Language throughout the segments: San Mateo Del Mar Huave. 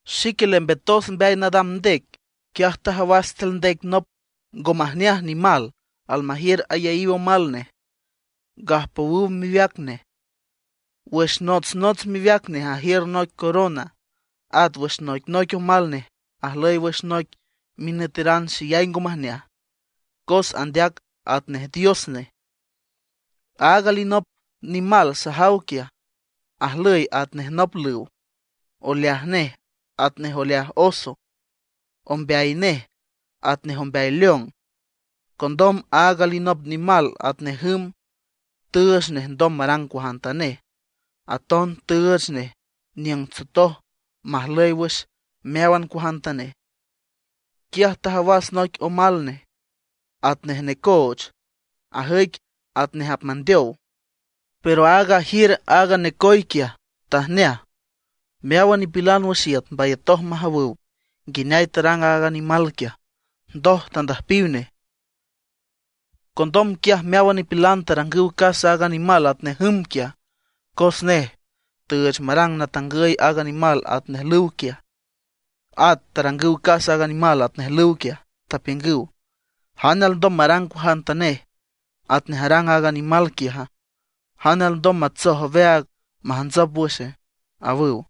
Xique lembetos mbeay nadam ndec. Quiaj tajawas tiül ndec nop ngo majneaj nimal almajiür ayaíw omal nej, gajpowüw miweac nej. Wüx notsnots miweac nej ajiür noic corona; at wüx noicnoic omal nej ajlüy wüx noic minüteran xeyay ngo majneaj, cos andeac atnej dios nej. Aaga alinop nimal sajaw quiaj, ajlüy atnej nop lüw, oleaj nej atnej oleaj oso, ombeay nej atnej ombeay león. Condom aaga alinop nimal atnej jüm tüüch nej ndom marang cuajantanej; aton tüüch nej niüng tsotoj majlüy wüx meáwan cuajantanej. Quiaj tajawas noic omal nej atnej tajcoch, ajüic atnej apmandeow; pero aaga ajiür aaga tajcoch quiaj tajneaj. Meáwan nipilan wüx iüt mbayatoj majawüw nguineay tarang aaga nimal quiaj, ndoj tandüjpiw nej. Condom quiaj meáwan nipilan tarangüw casa aaga nimal atnej jüm quiaj, cos nej tüüch marang natangüy aaga nimal atnej lüw quiaj. At tarangüw casa aaga nimal atnej lüw quiaj, tapiüngüw: ―¿Jane alndom marang cuajantanej atnej arang aaga nimal quiaja? ¿Jane alndom matsoj aweaag majntsop wüxe? ―awüw.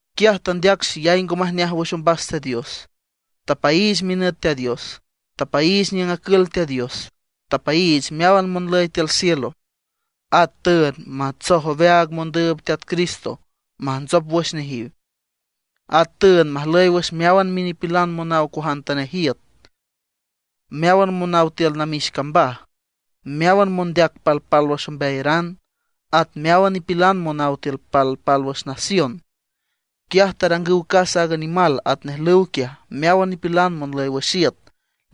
Quiaj tandeac xeyay ngo majneaj wüx ombas Teat Dios. Tapaiich minüt Teat Dios, tapaiich niüng acül Teat Dios, tapaiich meáwan monlüy tiül cielo. At tüünd matsoj aweaag mondüüb Teat Cristo majntsop wüx nejiw. At tüünd majlüy wüx meáwan nipilan monaw cuajantanej iüt, meáwan monaw tiül namix cambaj, meáwan mondeac palpálwüx ombeayaran, at meáwan nipilan monaw tiül palpálwüx nación. Quiaj tarangüw casa aaga nimal atnej lüw quiaj meáwan nipilan monlüy wüx iüt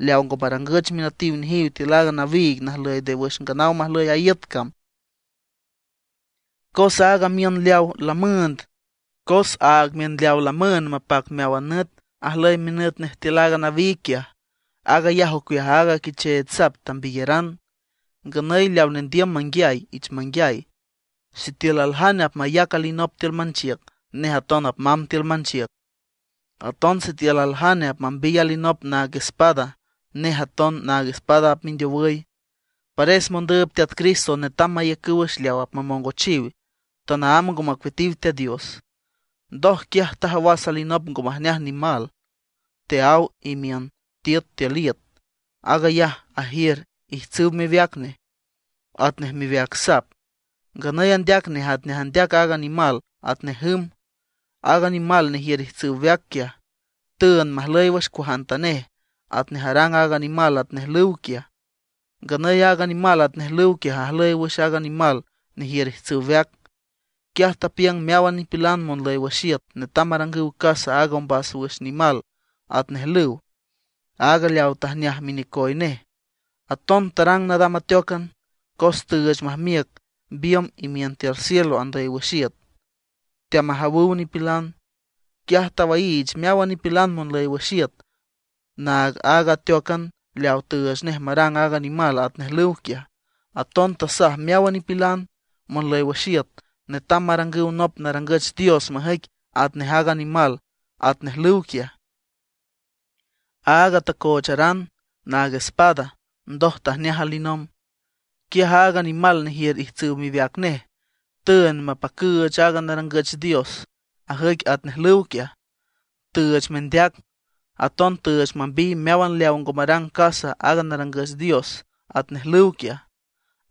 leaw ngo marangüch minütiw nejiw tiül aaga nawiig najlüy nde wüx nganaw majlüy a iüt cam. Cos aag miün leaw lamüünd mapac meáwan nüt ajlüy minüt nej tiül aaga nawiig quiaj. Aag ayaj ocueaj aaga Quicheech Sap tambiyaran. Nganüy leaw nendiüm manguiay, ich manguiay. Sitiül aljane apmayac alinop tiül manchiüc, nej aton apmamb tiül manchiüc. Aton sitiül aljane apmambiy alinop naag espada, nej aton naag espada apmindeowüy. Pares mondüüb Teat Cristo netam maiücüw wüx leaw apmamongochiw, tanaámb ngo macueatiw Teat Dios. Ndoj quiaj tajawas alinop ngo majneaj nimal teaáw imiün tiüt tiül iüt. Aag ayaj ajiür ijtsüw miweac nej atnej miweac sap; nganüy andeac nej atnej andeac aaga nimal atnej jüm. Aaga nimal nejiür ijtsüw weac quiaj, tüünd majlüy wüx cuajantanej atnej arang aaga nimal atnej lüw quiaj. Nganüy aaga nimal atnej lüw quiaj ajlüy wüx aaga nimal nejiür ijtsüw weac. Quiaj tapiüng meáwan nipilan monlüy wüx iüt netam marangüw casa aaga ombas wüx nimal atnej lüw, aaga leaw tajneaj minecoy nej. Aton tarang nadam ateócan, cos tüüch majmiüc biümb imiün tiül cielo andüy wüx iüt, teamajawüw nipilan. Quiaj tawaiich meáwan nipilan monlüy wüx iüt naag aaga ateócan leawa tüüch nej marang aaga nimal atnej lüw quiaj. Aton tasaj meáwan nipilan monlüy wüx iüt netam marangüw nop narangüch dios majüic atnej aaga nimal atnej lüw quiaj, aaga tacoocharan naag espada ndoj tajneaj alinomb. Quiaj aaga nimal nejiür ijtsüw miweac nej tüünd mapacüüch aaga narangüch dios ajüic atnej lüw quiaj, tüüch mendeac. Aton tüüch mambiy meáwan leawa ngo marang casa aaga narangüch dios atnej lüw quiaj.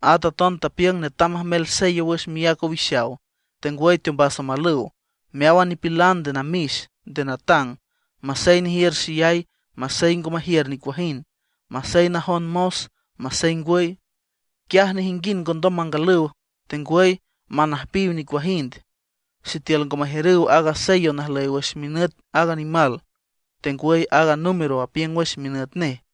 At aton tapiüng netam majmel sello wüx miác owixaw, tengwüy teombas omalüw meáwan nipilan nde namix, nde natang; masey nejiür xeyay, masey ngo majiür nicuajind; masey najon mos, masey ngwüy. Quiaj nejinguind ngondom mangalüw tengwüy manüjpiw nicuajind sitiül ngo majiürüw aaga sello najlüy wüx minüt aaga nimal, tengwüy aaga número apiüng wüx minüt nej.